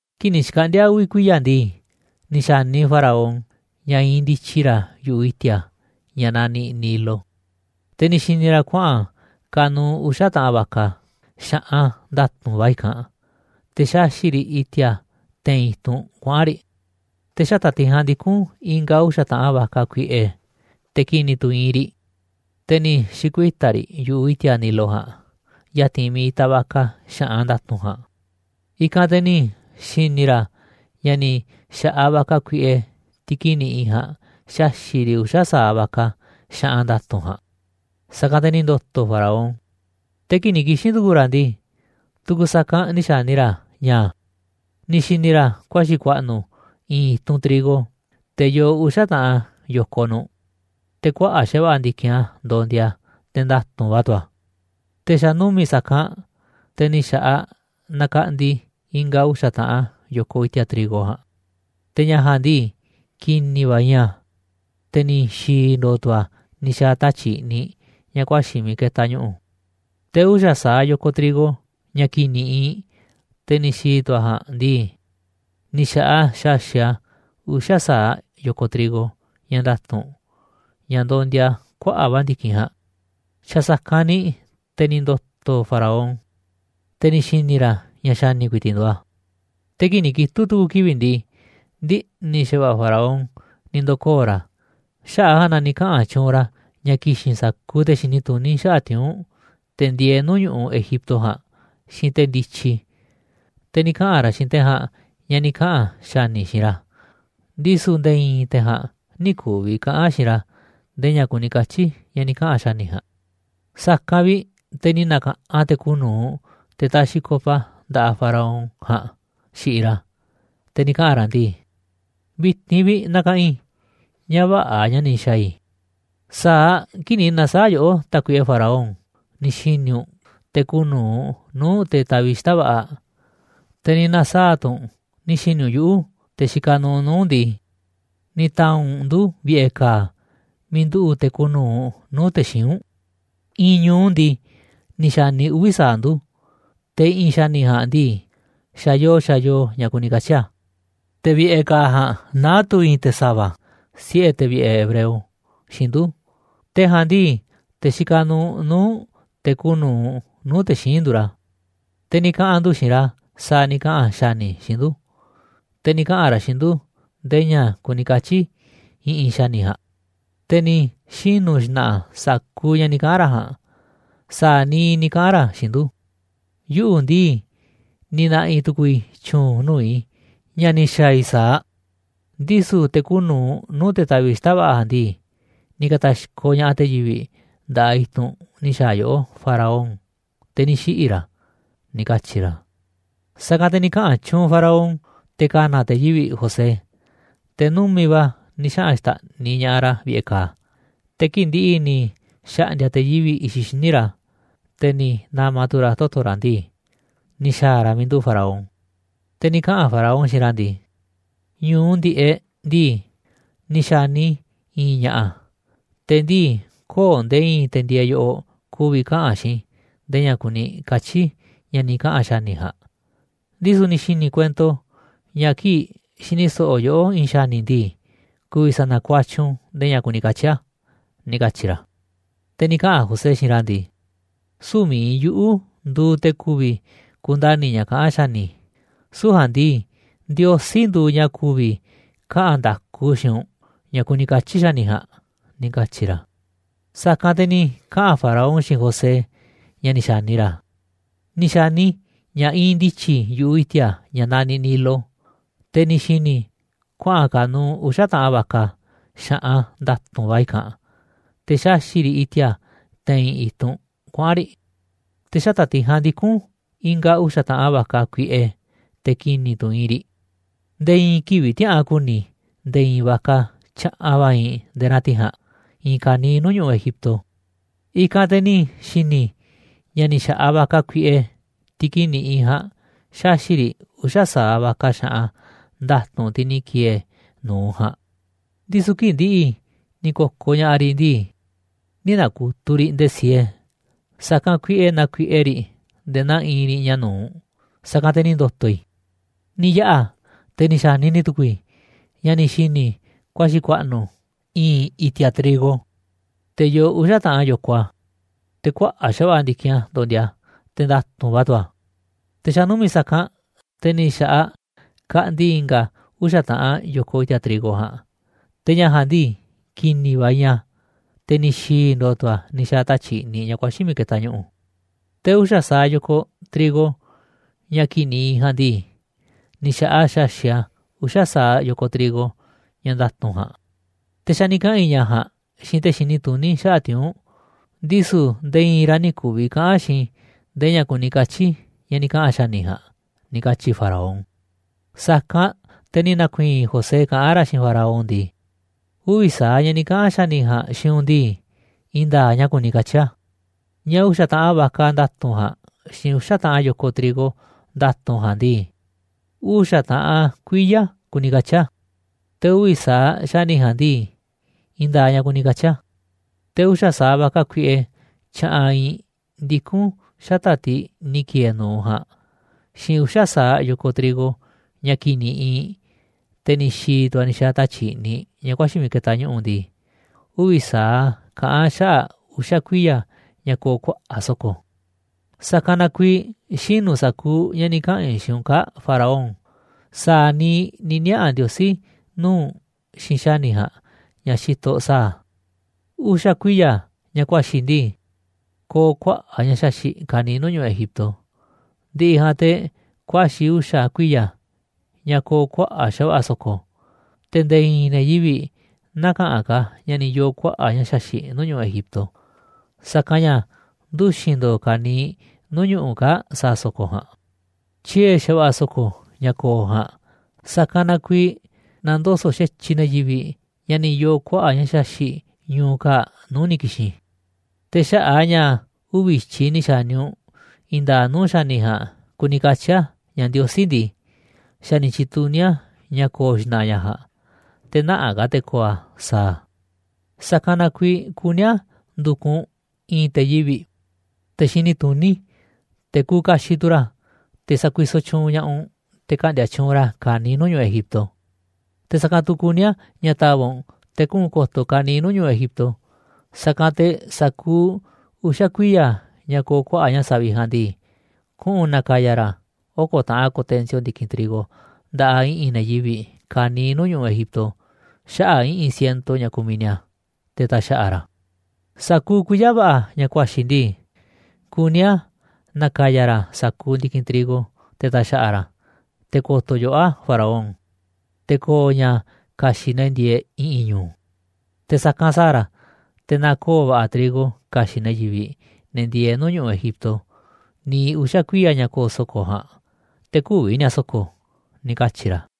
Kii̱ꞌ ni̱ xkaꞌndi̱a̱ uvi̱ kuiya̱ ndii, ni̱ xa̱ni Faraón ña̱ iinꞌ ndityi ra̱ yu̱ꞌuꞌ i̱ti̱a̱, ña̱ naniꞌ Nilo, te̱ ni̱ xi̱ni̱ ra̱ kuaꞌa̱n ka̱nu̱u̱ uxa̱ taꞌan vaca, xa̱ꞌan nda̱tu̱nꞌ va̱ i̱kanꞌ, te̱ xaꞌxi̱ꞌ riꞌ i̱ti̱a̱ te̱i̱n i̱tunꞌ kuaꞌa̱n riꞌ. Te̱ xata̱ꞌ tiꞌ ja̱a̱nꞌ ndikún i̱nga̱ uxa̱ taꞌan vaca kuiꞌe, te̱ ki̱ni̱ tu̱ iinꞌ riꞌ, te̱ ni̱ xi̱kuita̱ riꞌ yu̱ꞌuꞌ i̱ti̱a̱ Nilo ja̱a̱nꞌ ya̱ti̱n miiꞌ itaꞌ vaca xa̱ꞌan nda̱tu̱nꞌ ja̱a̱nꞌ. I̱kanꞌ te̱ ni̱ xi̱ni̱ ra̱ ña̱ ni̱ xa̱ꞌaꞌ vaca kuiꞌe, tiꞌ ki̱ni̱ iinꞌ ja̱a̱nꞌ, xaxi̱ꞌ riꞌ uxa̱ sa̱aꞌ vaca xa̱ꞌan nda̱tu̱nꞌ ja̱a̱nꞌ. Sa̱kanꞌ te̱ ni̱ ndo̱to̱ Faraón. Te̱ kii̱ꞌ ni̱ kixi̱n tu̱ku̱u̱ ra̱ ndii, tu̱ku̱ sa̱kanꞌ ni̱ xa̱ni ra̱ ña̱ ni̱ xi̱ni̱ ra̱ kuaxi̱ ku̱a̱ꞌnu̱ i̱i̱n i̱tunꞌ trigo, te̱ yoo uxa̱ taꞌan yo̱koꞌ nu̱ꞌ, te̱ kuaꞌa̱ꞌ xa̱va̱ꞌa̱ ndi̱kinꞌ a̱ ndondia, te̱ nda̱tu̱nꞌ va̱ tu̱ a̱. Te̱ xa̱ numi̱ꞌ sa̱kanꞌ, te̱ ni̱ xa̱ꞌaꞌ nakaꞌndi i̱nga̱ uxa̱ taꞌan yo̱koꞌ i̱ti̱a̱ trigo ja̱a̱nꞌ, te̱ ña̱ ja̱a̱nꞌ ndii, ki̱ni̱ va̱ iinꞌ a̱, te̱ ni̱ xi̱i̱ ndo̱o̱ tu̱ a̱ ni̱ xa̱a̱ tatyi̱ꞌ i̱ꞌniꞌ ña̱ ku̱a̱xi̱ miiꞌ ketaꞌ ñu̱ꞌu̱. Te̱ uxa̱ sa̱aꞌ yo̱koꞌ trigo, ña̱ ki̱ni̱ iinꞌ, te̱ ni̱ xi̱i̱ tu̱ a̱ ja̱a̱nꞌ ndii, ni̱ xa̱ꞌaꞌ a̱ xaxi̱ꞌ a̱ uxa̱ sa̱aꞌ yo̱koꞌ trigo, ña̱ nda̱tu̱nꞌ, ña̱ ndondia kuaꞌa̱ꞌ va̱ ndi̱kinꞌ ja̱a̱nꞌ. Xa̱ sa̱kanꞌ ni̱ te̱ ni̱ ndo̱to̱ Faraón, te̱ ni̱ xi̱ni̱ ra̱ ña̱ xa̱ni̱ ku̱i̱ti̱ꞌ nduuꞌ a̱. Te̱ kii̱ꞌ ni̱ kitu̱ꞌ tu̱ku̱ kivi̱ꞌ ndii, ndiꞌni̱ xa̱va̱ꞌa̱ Faraón ni̱ ndo̱koo̱ ra̱, xaꞌa̱ꞌ a̱ ja̱a̱nꞌ na ni̱ kaꞌa̱n tyuunꞌ ra̱ ña̱ ki̱xi̱n sa̱kuuꞌ te̱ xini tuní xaꞌa̱ꞌ tiuu̱nꞌ, te̱ ndieeꞌ nuu̱ꞌ ñu̱ꞌuꞌ Egipto ja̱a̱nꞌ, xiinꞌ te̱ ndityi, te̱ ni̱ kaꞌa̱n ra̱ xiinꞌ te̱ ja̱a̱nꞌ ña̱ ni̱ kaꞌa̱n xa̱ni̱ xiinꞌ ra̱, ndisu̱ nde̱e̱ i̱i̱n te̱ ja̱a̱nꞌ nï̱ ku̱vi̱ kaꞌa̱n xiinꞌ ra̱ ndee ña̱ kuni katyi̱ ña̱ ni̱ kaꞌa̱n xa̱ni̱ ja̱a̱nꞌ. Sa̱kanꞌ vi̱ꞌ te̱ ni̱ na̱ka̱ꞌanꞌ te̱ kuuꞌ nu̱uꞌ, te̱ taxiꞌ copa nda̱ꞌaꞌ Faraón ja̱a̱nꞌ xiꞌiꞌ ra̱, te̱ ni̱ kaꞌa̱n ra̱ ndii: ―Vi̱ti̱n vi̱ꞌ nakaꞌanꞌ i̱ ña̱ vä̱ꞌa̱ ña̱ ni̱ xa̱a̱ i̱. Sa̱aꞌ kii̱ꞌ ni̱ na̱saa̱ꞌ yoꞌó, tákuiꞌe Faraón, ni̱ xi̱ni̱ u̱nꞌ te̱ kuuꞌ nu̱uꞌ nuu̱ꞌ te̱ taviꞌ xita̱ꞌ va̱ꞌa̱, te̱ ni̱ na̱saa̱ꞌ tu̱ u̱nꞌ ni̱ xi̱ni̱ u̱nꞌ yuꞌu̱, te̱ xikaꞌ nuuꞌ nuu̱ꞌ u̱nꞌ ndii, ni̱ ta̱a̱nꞌ u̱nꞌ ndu̱ vi̱ꞌe̱ ka̱a̱ miiꞌ nduꞌu̱ꞌ te̱ kuuꞌ nu̱uꞌ nuu̱ꞌ te̱ xíinꞌ u̱nꞌ. I̱i̱n ñu̱u ndii, ni̱ xa̱ni uvi̱ sa̱aꞌ ndu̱, te̱ i̱ꞌi̱n xa̱ni̱ ja̱a̱nꞌ ndii, xa̱ yoo xa̱ yoo ña̱ kuni katyi̱ a̱. Te̱ vi̱ꞌe̱ ka̱a̱ ja̱a̱nꞌ naá tu̱ i̱i̱n te̱ sa̱va̱, siꞌe̱ te̱ vi̱ꞌe̱ hebreo, xiinꞌ ndu̱, te̱ ja̱a̱nꞌ ndii, te̱ xikaꞌ nuuꞌ nuu̱ꞌ te̱ kuuꞌ nu̱uꞌ nuu̱ꞌ te̱ xíinꞌ nduuꞌ ra̱. Te̱ ni̱ kaꞌa̱n ndu̱ xiinꞌ ra̱ sa̱a̱ ni̱ kaꞌa̱n xa̱ni̱ xiinꞌ ndu̱, te̱ ni̱ kaꞌa̱n ra̱ xiinꞌ ndu̱ ndee ña̱ kuni katyi̱ i̱ꞌi̱n xa̱ni̱ ja̱a̱nꞌ. Te̱ ni̱ xinu̱ xna̱ꞌa̱ sa̱kuuꞌ ña̱ ni̱ kaꞌa̱n ra̱ ja̱a̱nꞌ, sa̱a̱ niiꞌ ni̱ kaꞌa̱n ra̱ xiinꞌ ndu̱. Yuꞌu̱ ndii ni̱ na̱ꞌi̱ tu̱ku̱u̱ i̱ tyu̱u̱n nuu̱ꞌ i̱ ña̱ ni̱ xa̱a̱ i̱ sa̱aꞌ, ndisu̱ te̱ kuuꞌ nu̱uꞌ nuu̱ꞌ te̱ taviꞌ xita̱ꞌ va̱ꞌa̱ ja̱a̱nꞌ ndii, ni̱ ka̱ta̱xkoꞌ ña̱ꞌaꞌ te̱ yivi̱ꞌ nda̱ꞌaꞌ i̱tunꞌ ni̱ xa̱a̱ yoꞌó, Faraón, te̱ ni̱ xiꞌi̱ ra̱ ―ni̱ katyi̱ ra̱. Sa̱kanꞌ te̱ ni̱ kaꞌa̱n tyuunꞌ Faraón te̱ ka̱na̱ te̱ yivi̱ꞌ José, te̱ numi̱ꞌ va̱ ni̱ xaꞌa̱n xta̱ꞌniꞌ ña̱ꞌaꞌ ra̱ vi̱ꞌe̱ ka̱a̱. Te̱ kii̱ꞌ ndi̱ꞌi̱ ni̱ xa̱ꞌndi̱a̱ te̱ yivi̱ꞌ i̱xiꞌ xíniꞌ ra̱, te̱ ni̱ na̱ma̱ tu̱ ra̱ toto̱ ra̱ ndii, ni̱ xa̱a̱ ra̱ miiꞌ nduꞌu̱ꞌ Faraón. Te̱ ni̱ kaꞌa̱n Faraón xiinꞌ ra̱ ndii: ―Ñu̱u ndi̱ꞌeꞌ ndii, ni̱ xa̱ni i̱ i̱i̱n ña̱ꞌa̱, te̱ ndii köo̱ꞌ nde̱e̱ i̱i̱n te̱ ndieeꞌ yoꞌoꞌ ku̱vi̱ kaꞌa̱n xiinꞌ i̱ ndee ña̱ kuni katyi̱ ña̱ ni̱ kaꞌa̱n xa̱ni̱ ja̱a̱nꞌ, ndisu̱ ni̱ xi̱ni̱ i̱ kuento ña̱ kii̱ꞌ xini so̱ꞌo̱ yoꞌó i̱i̱n xa̱ni̱ ndii, ku̱vi̱ sa̱na̱kuatyiꞌ u̱nꞌ ndee ña̱ kuni katyi̱ a̱ ―ni̱ katyi̱ ra̱. Te̱ ni̱ kaꞌa̱n José xiinꞌ ra̱ ndii: ―Süu̱ꞌ mi̱iꞌ yuꞌu̱ nduuꞌ te̱ ku̱vi̱ kundani̱ ña̱ kaꞌán xa̱ni̱, süu̱ꞌ ja̱a̱nꞌ ndii, Ndiosí nduuꞌ ña̱ ku̱vi̱ kaꞌa̱n nda̱ku xiinꞌ u̱nꞌ ña̱ kuni katyi̱ xa̱ni̱ ja̱a̱nꞌ ―ni̱ katyi̱ ra̱. Sa̱kanꞌ te̱ ni̱ kaꞌa̱n Faraón xiinꞌ José ña̱ ni̱ xa̱ni ra̱: ―Ni̱ xa̱ni i̱ ña̱ iinꞌ ndityi i̱ yu̱ꞌuꞌ i̱ti̱a̱ ña̱ naniꞌ Nilo, te̱ ni̱ xi̱ni̱ i̱ kuaꞌa̱n ka̱nu̱u̱ uxa̱ taꞌan vaca, xa̱ꞌan nda̱tu̱nꞌ va̱ i̱kanꞌ, te̱ xaꞌxi̱ꞌ riꞌ i̱ti̱a̱ te̱i̱n i̱tunꞌ kuaꞌa̱n riꞌ. Te̱ xata̱ꞌ tiꞌ ja̱a̱nꞌ ndikún i̱nga̱ uxa̱ taꞌan vaca kuiꞌe, te̱ ki̱ni̱ tu̱ iinꞌ riꞌ. Nde̱e̱ i̱i̱n kivi̱ꞌ tiäꞌa̱an ku̱ni̱ i̱ nde̱e̱ i̱i̱n vaca tyaꞌanꞌ va̱ iinꞌ nde̱e̱ naa tiꞌ ja̱a̱nꞌ i̱i̱n ka̱niiꞌ nuu̱ꞌ ñu̱ꞌuꞌ Egipto. I̱kanꞌ te̱ ni̱ xi̱ni̱ i̱ ña̱ ni̱ xa̱ꞌaꞌ vaca kuiꞌe, tiꞌ ki̱ni̱ iinꞌ ja̱a̱nꞌ, xaxi̱ꞌ riꞌ uxa̱ sa̱aꞌ vaca xa̱ꞌan nda̱tu̱nꞌ tiꞌ ni̱ ki̱e̱e̱ nu̱uꞌ ja̱a̱nꞌ. Ndisu̱ kii̱ꞌ ndi̱ꞌi̱ ni̱ ko̱koꞌ ña̱ꞌaꞌ riꞌ ndii, nï̱ na̱ku̱tuꞌ riꞌ nde̱e̱ siee, sa̱kanꞌ kuiꞌe naa kuiꞌe riꞌ nde̱e̱ naa iinꞌ riꞌ ña̱ nu̱uꞌ. Sa̱kanꞌ te̱ ni̱ ndo̱to̱ i̱. 'Ni̱ yaꞌa̱, te̱ ni̱ xa̱ni ni̱ tu̱ku̱u̱ i̱, ña̱ ni̱ xi̱ni̱ i̱ kuaxi̱ ku̱a̱ꞌnu̱ i̱i̱n i̱ti̱a̱ trigo, te̱ yoo uxa̱ taꞌan yo̱koꞌ a̱, te̱ kuaꞌa̱ꞌ xa̱va̱ꞌa̱ ndi̱kinꞌ a̱ ndondia, te̱ nda̱tu̱nꞌ va̱ tu̱ a̱. Te̱ xa̱ numi̱ꞌ sa̱kanꞌ, te̱ ni̱ xa̱ꞌaꞌ kaꞌndi i̱nga̱ uxa̱ taꞌan yo̱koꞌ i̱ti̱a̱ trigo ja̱a̱nꞌ, te̱ ña̱ ja̱a̱nꞌ ndii, ki̱ni̱ va̱ iinꞌ a̱, te̱ ni̱ xi̱i̱ ndo̱o̱ tu̱ a̱ ni̱ xa̱a̱ tatyi̱ꞌ i̱ꞌniꞌ ña̱ ku̱a̱xi̱ miiꞌ ketaꞌ ñu̱ꞌu̱. Te̱ uxa̱ sa̱aꞌ yo̱koꞌ trigo, ña̱ ki̱ni̱ iinꞌ ja̱a̱nꞌ ndii, ni̱ xa̱ꞌaꞌ a̱ xaxi̱ꞌ a̱ uxa̱ sa̱aꞌ yo̱koꞌ trigo ña̱ nda̱tu̱nꞌ ja̱a̱nꞌ. Te̱ xa̱ ni̱ kaꞌa̱n i̱ ña̱ ja̱a̱nꞌ xiinꞌ te̱ xini tuní xaꞌa̱ꞌ tiuu̱nꞌ, ndisu̱ nde̱e̱ i̱i̱n ra̱ nï̱ ku̱vi̱ kaꞌa̱n xiinꞌ i̱ nde̱e̱ ña̱ kuni katyi̱ ña̱ ni̱ kaꞌa̱n xa̱ni̱ ja̱a̱nꞌ ―ni̱ katyi̱ Faraón. Sa̱kanꞌ te̱ ni̱ na̱ku̱i̱i̱n José kaꞌán ra̱ xiinꞌ Faraón ndii: ―Uvi̱ sa̱aꞌ ña̱ ni̱ kaꞌa̱n xa̱ni̱ ja̱a̱nꞌ xiinꞌ u̱nꞌ ndii, i̱i̱n nda̱a̱ꞌ ña̱ kuni katyi̱ a̱. Ña̱ uxa̱ taꞌan vaca nda̱tu̱nꞌ ja̱a̱nꞌ xiinꞌ uxa̱ taꞌan yo̱koꞌ trigo nda̱tu̱nꞌ ja̱a̱nꞌ ndii, uxa̱ taꞌan kuiya̱ kuni katyi̱ a̱. Te̱ uvi̱ sa̱aꞌ xa̱ni̱ ja̱a̱nꞌ ndii, i̱i̱n nda̱a̱ꞌ ña̱ kuni katyi̱ a̱. Te̱ uxa̱ sa̱aꞌ vaca kuiꞌe tyaꞌanꞌ iinꞌ ndikún xata̱ꞌ tiꞌ ni̱ ki̱e̱e̱ nu̱uꞌ ja̱a̱nꞌ, xiinꞌ uxa̱ sa̱aꞌ yo̱koꞌ trigo ña̱ ki̱ni̱ iinꞌ, te̱ ni̱ xi̱i̱ tu̱ a̱ ni̱ xa̱a̱ tatyi̱ꞌ i̱ꞌniꞌ ña̱ kuaxi̱ miiꞌ ketaꞌ ñu̱ꞌu̱ ndii, uvi̱ sa̱aꞌ a̱ kaꞌán xaꞌa̱ꞌ uxa̱ kuiya̱ ña̱ ko̱o̱ kuaꞌa̱ꞌ so̱ko̱. ’Sa̱kanꞌ na kuiiꞌ xinu̱ sa̱kuuꞌ ña̱ ni̱ kaꞌa̱n i̱ xiinꞌ u̱nꞌ kaa̱ꞌ Faraón, sa̱a̱ niiꞌ ni̱ niaꞌa̱ Ndiosí nuu̱ꞌ u̱nꞌ xiinꞌ xa̱ni̱ ja̱a̱nꞌ ña̱ xitoꞌ sa̱a̱ a̱. Uxa̱ kuiya̱ ña̱ kuaxi̱ ndii, ko̱o̱ kuaꞌa̱ꞌ ña̱ xaxi̱ꞌ ka̱niiꞌ nuu̱ꞌ ñu̱ꞌuꞌ Egipto, ndi̱ꞌi̱ ja̱a̱nꞌ te̱ kuaxi̱ uxa̱ kuiya̱ ña̱ ko̱o̱ kuaꞌa̱ꞌ xa̱va̱ꞌa̱ so̱ko̱, te̱ nde̱e̱ i̱i̱n ne̱ yivi̱ꞌ nä̱ka̱ꞌanꞌ ka̱ ña̱ ni̱ yoo̱ kuaꞌa̱ꞌ ña̱ xaxi̱ꞌ nuu̱ꞌ ñu̱ꞌuꞌ Egipto, sa̱kanꞌ ña̱ nduxi̱n ndo̱o̱ ka̱niiꞌ nuu̱ꞌ ñu̱ꞌuꞌ kaa̱ꞌ sa̱a̱ so̱ko̱ ja̱a̱nꞌ. Tyie̱ xa̱va̱ꞌa̱ so̱ko̱ ña̱ ko̱o̱ ja̱a̱nꞌ, sa̱kanꞌ na kuiiꞌ na̱ndoso̱ꞌ xa̱tyiꞌ ne̱ yivi̱ꞌ ña̱ ni̱ yoo̱ kuaꞌa̱ꞌ ña̱ xaxi̱ꞌ ñu̱u̱ kaa̱ꞌ nuu̱ꞌ ni̱ ki̱xi̱n. Te̱ xaꞌa̱ꞌ a̱ ña̱ uvi̱ i̱tyiꞌ ni̱ xa̱ni u̱nꞌ i̱i̱n nda̱a̱ꞌ nuu̱ꞌ xa̱ni̱ ja̱a̱nꞌ kuni katyi̱ a̱ ña̱ Ndiosí ndii, xa̱ ni̱ tyi̱tuní a̱ ña̱ ko̱o̱ xna̱ꞌa̱ ña̱ ja̱a̱nꞌ, te̱ nä̱ꞌanꞌ ka̱ te̱ ko̱o̱ a̱ sa̱a̱ a̱. ’Sa̱kanꞌ na kuiiꞌ kuní a̱ ndu̱kuꞌ u̱nꞌ i̱i̱n te̱ yivi̱ꞌ, te̱ xini tuní, te̱ kuuꞌ kaxiꞌ tu̱ ra̱, te̱ sa̱kuisoꞌ tyuunꞌ ña̱ꞌaꞌ u̱nꞌ te̱ ka̱ꞌndi̱a̱ tyuunꞌ ra̱ ka̱niiꞌ nuu̱ꞌ ñu̱ꞌuꞌ Egipto. Te̱ sa̱kanꞌ tu̱ kuní a̱ ña̱ ta̱va̱ꞌ u̱nꞌ te̱ kuꞌu̱n ko̱to̱ ka̱niiꞌ nuu̱ꞌ ñu̱ꞌuꞌ Egipto, sa̱kanꞌ te̱ sa̱kuuꞌ uxa̱ kuiya̱ ña̱ ko̱o̱ kuaꞌa̱ꞌ ña̱ savi̱ꞌ ja̱a̱nꞌ ndii, kuꞌu̱n na̱ka̱ya̱ ra̱ a̱ oko̱ taꞌan ko̱tensio ndi̱kinꞌ trigo nda̱ꞌaꞌ i̱ꞌi̱n ne̱ yivi̱ꞌ ka̱niiꞌ nuu̱ꞌ ñu̱ꞌuꞌ Egipto, xaꞌa̱ꞌ i̱ꞌi̱n ciento ña̱ kumiꞌ ni̱a̱, te̱ ta̱xa̱ꞌa̱ ra̱ a̱. Sa̱kuuꞌ kuiya̱ va̱ꞌa̱ ña̱ kuaxi̱ ndii, kuní a̱ na̱ka̱ya̱ ra̱ sa̱kuuꞌ ndi̱kinꞌ trigo, te̱ ta̱xa̱ꞌa̱ ra̱ a̱, te̱ ko̱to̱ yoꞌó a̱ Faraón, te̱ ko̱o̱ ña̱ ka̱xi̱ꞌ ne̱ ndieeꞌ i̱ꞌi̱n ñu̱u̱. Te̱ sa̱kanꞌ sa̱a̱ ra̱, te̱ na̱koo̱ va̱ꞌa̱ trigo ka̱xi̱ꞌ ne̱ yivi̱ꞌ, ne̱ ndieeꞌ nuu̱ꞌ ñu̱ꞌuꞌ Egipto niiꞌ uxa̱ kuiya̱ ña̱ ko̱o̱ so̱ko̱ ja̱a̱nꞌ, te̱ kü̱vi̱ ni̱a̱ so̱ko̱ ―ni̱ katyi̱ ra̱.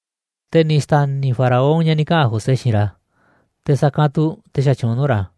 Te̱ ni̱ xta̱ni̱ Faraón ña̱ ni̱ kaꞌa̱n José xiinꞌ ra̱, te̱ sa̱kanꞌ tu̱ te̱ xatyuunꞌ nuu̱ꞌ ra̱.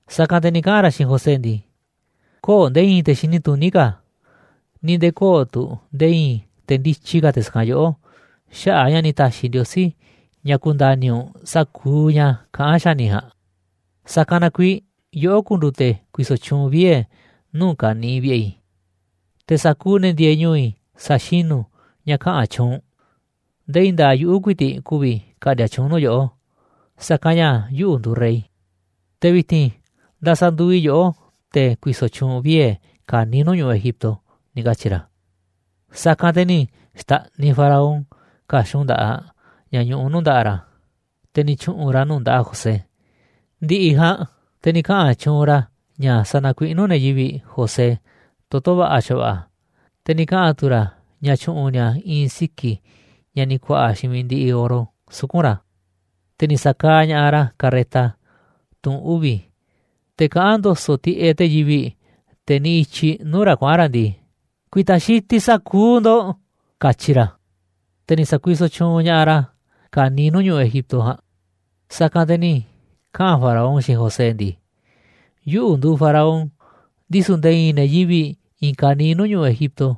Sa̱kanꞌ te̱ ni̱ kaꞌa̱n ra̱ xiinꞌ José ndii: ―Köo̱ꞌ nde̱e̱ i̱i̱n te̱ xini tuní ka̱, ni̱ nde̱e̱ köo̱ꞌ tu̱ nde̱e̱ i̱i̱n te̱ ndityi ka̱ te̱ sa̱kanꞌ yoꞌó xaꞌa̱ꞌ a̱ ña̱ ni̱ ta̱xi̱ Ndiosí ña̱ ku̱nda̱ni̱ u̱nꞌ sa̱kuuꞌ ña̱ kaꞌán xa̱ni̱ ja̱a̱nꞌ. Sa̱kanꞌ na kuiiꞌ yoꞌó ku̱ndu̱u̱ te̱ ku̱i̱so̱ tyuunꞌ vie̱ nuu̱ꞌ ka̱niiꞌ vi̱ꞌe̱ i̱, te̱ sa̱kuuꞌ ne̱ ndieeꞌ ñu̱u̱ i̱ sa̱xinu̱ ña̱ kaꞌa̱n tyuunꞌ u̱nꞌ, ndee i̱i̱n nda̱a̱ꞌ yuꞌu̱ ku̱i̱ti̱ꞌ ku̱vi̱ ka̱ꞌndi̱a̱ tyuunꞌ nuu̱ꞌ yoꞌó, sa̱kanꞌ ña̱ yuꞌu̱ nduuꞌ rey. Te̱ vi̱ti̱n ndasanduuꞌ i̱ yoꞌó te̱ ku̱i̱so̱ tyuunꞌ vie̱ ka̱niiꞌ nuu̱ꞌ ñu̱ꞌuꞌ Egipto ―ni̱ katyi̱ ra̱. Sa̱kanꞌ te̱ ni̱ xta̱ꞌniꞌ Faraón ka̱xun nda̱ꞌaꞌ ña̱ ñuꞌuꞌ nuu̱ꞌ nda̱ꞌaꞌ ra̱, te̱ ni̱ tyu̱ꞌu̱n ra̱ a̱ nuu̱ꞌ nda̱ꞌaꞌ José. Ndi̱ꞌi̱ ja̱a̱nꞌ, te̱ ni̱ kaꞌa̱n tyuunꞌ ra̱ ña̱ sa̱na̱kuiꞌnú ne̱ yivi̱ꞌ José toto̱ va̱ꞌa̱ xa̱va̱ꞌa̱, te̱ ni̱ kaꞌa̱n tu̱ ra̱ ña̱ tyu̱ꞌu̱n ni̱a̱ i̱i̱n siki̱ ña̱ ni̱ ku̱a̱ꞌa̱ xiinꞌ mi̱iꞌ ndiꞌiꞌ oro suku̱nꞌ ra̱. Te̱ ni̱ sa̱kaaꞌ ña̱ꞌaꞌ ra̱ carreta, tunꞌ uvi̱, te̱ kaꞌán ndo̱so̱ꞌ tiꞌeꞌ te̱ yivi̱ꞌ, te̱ niꞌiꞌ i̱tyiꞌ nuu̱ꞌ ra̱ kuaꞌa̱n ra̱ ndii: ―Ku̱i̱ta̱ xitiꞌ sa̱kuuꞌ ndo̱ꞌ ―katyi ra̱. Te̱ ni̱ sa̱kuisoꞌ tyuunꞌ ña̱ꞌaꞌ ra̱ ka̱niiꞌ nuu̱ꞌ ñu̱ꞌuꞌ Egipto ja̱a̱nꞌ. Sa̱kanꞌ te̱ ni̱ kaꞌa̱n Faraón xiinꞌ José ndii: ―Yuꞌu̱ nduuꞌ Faraón, ndisu̱ nde̱e̱ i̱i̱n ne̱ yivi̱ꞌ i̱i̱n ka̱niiꞌ nuu̱ꞌ ñu̱ꞌuꞌ Egipto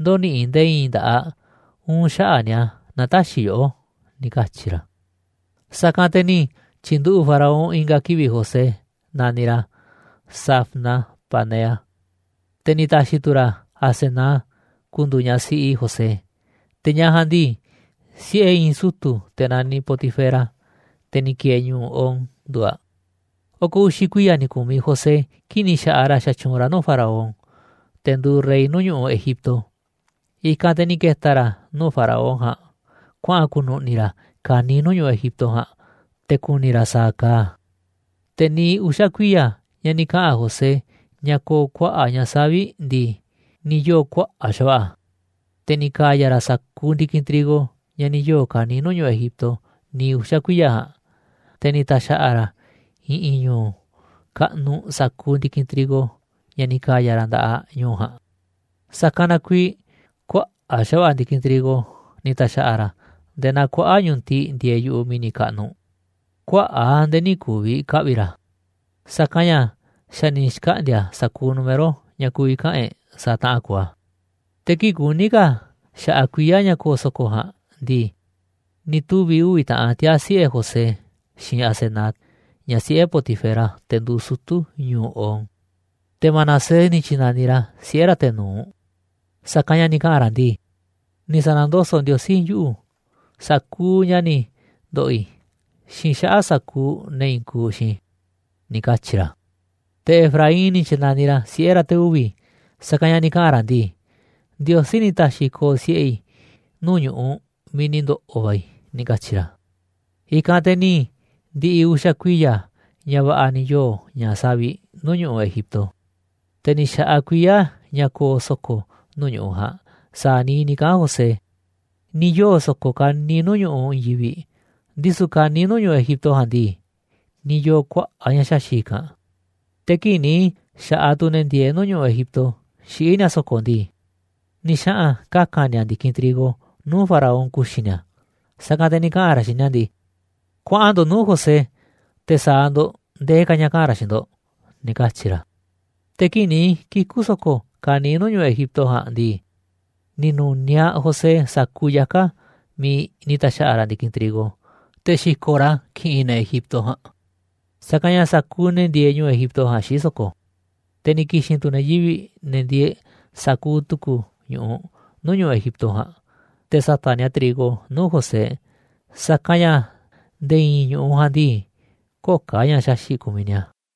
ndö̱ni̱ꞌi̱ nde̱e̱ i̱i̱n nda̱ꞌaꞌ uun xaꞌa̱ꞌ ni̱a̱ naaꞌ tä̱xi̱ yoꞌó ―ni̱ katyi̱ ra̱. Sa̱kanꞌ te̱ ni̱ tyi̱nduꞌu̱ꞌ Faraón i̱nga̱ kivi̱ꞌ José naniꞌ ra̱ Zafnat-panea, te̱ ni̱ ta̱xi̱ tu̱ ra̱ Asenat ku̱ndu̱u̱ ñaꞌ siꞌi José, te̱ ñaꞌ ja̱a̱nꞌ ndii, siꞌe̱ i̱i̱n sutu̱ te̱ naniꞌ Potifera, te̱ ni̱ ki̱e̱e̱ ñu̱u̱ On, nduuꞌ aꞌ. Oko̱ uxi̱ kuiya̱ ni̱ ku̱miꞌ José kii̱ꞌ ni̱ xa̱ꞌaꞌ ra̱ xatyuunꞌ ra̱ nuu̱ꞌ Faraón, te̱ nduuꞌ rey nuu̱ꞌ ñu̱ꞌuꞌ Egipto. I̱kanꞌ te̱ ni̱ ke̱ta̱ ra̱ nuu̱ꞌ Faraón ja̱a̱nꞌ kuaꞌa̱n ku̱nu̱ꞌni̱ ra̱ ka̱niiꞌ nuu̱ꞌ ñu̱ꞌuꞌ Egipto ja̱a̱nꞌ te̱ ku̱ni̱ ra̱ sa̱a̱ kaaꞌ a̱. Te̱ niiꞌ uxa̱ kuiya̱ ña̱ ni̱ kaꞌa̱n José ña̱ ko̱o̱ kuaꞌa̱ꞌ ña̱ savi̱ꞌ ndii, ni̱ yoo̱ kuaꞌa̱ꞌ xa̱va̱ꞌa̱ a̱. Te̱ ni̱ ka̱ya̱ ra̱ sa̱kuuꞌ ndi̱kinꞌ trigo ña̱ ni̱ yoo̱ ka̱niiꞌ nuu̱ꞌ ñu̱ꞌuꞌ Egipto niiꞌ uxa̱ kuiya̱ ja̱a̱nꞌ, te̱ ni̱ ta̱xa̱ꞌa̱ ra̱ a̱ i̱ꞌi̱n ñu̱u̱ kaꞌnuꞌ sa̱kuuꞌ ndi̱kinꞌ trigo ña̱ ni̱ ka̱ya̱ ra̱ nda̱ꞌaꞌ ñu̱u̱ ja̱a̱nꞌ. Sa̱kanꞌ na kuiiꞌ kuaꞌa̱ꞌ xa̱va̱ꞌa̱ ndi̱kinꞌ trigo ni̱ ta̱xa̱ꞌa̱ ra̱ nde̱e̱ naa kuaꞌa̱ꞌ ñu̱tiꞌ ndieeꞌ yu̱ꞌuꞌ mi̱ni̱ kaꞌnuꞌ, kuaꞌa̱ꞌ a̱ nde̱e̱ nï̱ ku̱vi̱ ka̱ ka̱ꞌvi̱ ra̱, sa̱kanꞌ ña̱ xa̱ ni̱ xkaꞌndi̱a̱ a̱ sa̱kuuꞌ número ña̱ ku̱vi̱ kaꞌa̱n e̱ꞌ sa̱a̱ taꞌan kuuꞌ a̱. Te̱ kii̱ꞌ kuní ka̱ xa̱ꞌaꞌ kuiya̱ ña̱ ko̱o̱ so̱ko̱ ja̱a̱nꞌ ndii, ni̱ tuvi̱ uvi̱ taꞌan tiaa̱ siꞌe̱ José xiinꞌ Asenat, ñaꞌ siꞌe̱ Potifera, te̱ nduuꞌ sutu̱ ñu̱u̱ On. Te̱ Manasés ni̱ tyi̱na̱niꞌ ra̱ siꞌe̱ ra̱ te̱ nu̱uꞌ, sa̱kanꞌ ña̱ ni̱ kaꞌa̱n ra̱ ndii: “Ni̱ sa̱na̱ndoso̱ꞌ Ndiosí yuꞌu̱, sa̱kuuꞌ ña̱ ni̱ ndo̱ꞌo̱ i̱, xiinꞌ xaꞌa̱ꞌ sa̱kuuꞌ ne̱ i̱i̱n kuuꞌ xiinꞌ i̱”, ni̱ katyi̱ ra̱. Te̱ Efraín ni̱ tyi̱na̱niꞌ ra̱ siꞌe̱ ra̱ te̱ uvi̱, sa̱kanꞌ ña̱ ni̱ kaꞌa̱n ra̱ ndii: “Ndiosí ni̱ ta̱xi̱ ko̱o̱ siꞌe̱ i̱ nuu̱ꞌ ñu̱ꞌuꞌ miiꞌ ni̱ ndo̱ꞌo̱ va̱ i̱”, ni̱ katyi̱ ra̱. I̱kanꞌ te̱ ni̱ ndi̱ꞌi̱ uxa̱ kuiya̱ ña̱ va̱ꞌa̱ va̱ ni̱ yoo̱ ña̱ savi̱ꞌ nuu̱ꞌ ñu̱ꞌuꞌ Egipto, te̱ ni̱ xa̱ꞌaꞌ kuiya̱ ña̱ ko̱o̱ so̱ko̱ nuu̱ꞌ ñu̱ꞌuꞌ ja̱a̱nꞌ sa̱a̱ niiꞌ ni̱ kaꞌa̱n José. Ni̱ yoo̱ so̱ko̱ ka̱niiꞌ nuu̱ꞌ ñu̱ꞌuꞌ i̱i̱n yivi̱ꞌ, ndisu̱ ka̱niiꞌ nuu̱ꞌ ñu̱ꞌuꞌ Egipto ja̱a̱nꞌ ndii, ni̱ yoo̱ kuaꞌa̱ꞌ ña̱ xaxi̱ꞌ i̱kanꞌ. Te̱ kii̱ꞌ ni̱ xa̱ꞌaꞌ tu̱ ne̱ ndieeꞌ nuu̱ꞌ ñu̱ꞌuꞌ Egipto xiꞌí ni̱a̱ so̱ko̱ ndii, ni̱ xaꞌa̱n kaka̱n ni̱a̱ ndi̱kinꞌ trigo nuu̱ꞌ faraón ku̱xi̱ ni̱a̱, sa̱kanꞌ te̱ ni̱ kaꞌa̱n ra̱ xiinꞌ ni̱a̱ ndii: ―Kuaꞌan ndo̱ꞌ nuu̱ꞌ José, te̱ sa̱a̱ ndo̱ꞌ ndee ka̱ ña̱ kaꞌa̱n ra̱ xiinꞌ ndo̱ꞌ ―ni̱ katyi̱ ra̱. Te̱ kii̱ꞌ ni̱ kiku̱ so̱ko̱ ka̱niiꞌ nuu̱ꞌ ñu̱ꞌuꞌ Egipto ja̱a̱nꞌ ndii, ni̱ nu̱niaꞌ José sa̱kuuꞌ yaka̱ miiꞌ ni̱ ta̱xa̱ꞌa̱ ra̱ ndi̱kinꞌ trigo, te̱ xi̱ko̱ꞌ ra̱ a̱ ki̱ꞌi̱n ne̱ Egipto ja̱a̱nꞌ, sa̱kanꞌ ña̱ sa̱kuuꞌ ne̱ ndieeꞌ ñu̱ꞌuꞌ Egipto ja̱a̱nꞌ xiꞌí so̱ko̱. Te̱ ni̱ ki̱xi̱n tu̱ ne̱ yivi̱ꞌ, ne̱ ndieeꞌ sa̱kuuꞌ tu̱ku̱ ñu̱ꞌuꞌ nuu̱ꞌ ñu̱ꞌuꞌ Egipto ja̱a̱nꞌ te̱ sa̱ta̱ꞌ ni̱a̱ trigo nuu̱ꞌ José, sa̱kanꞌ ña̱ nde̱e̱ i̱i̱n ñu̱ꞌuꞌ ja̱a̱nꞌ ndii, köo̱ꞌ ka̱ ña̱ xaxi̱ꞌ kumiꞌ ni̱a̱.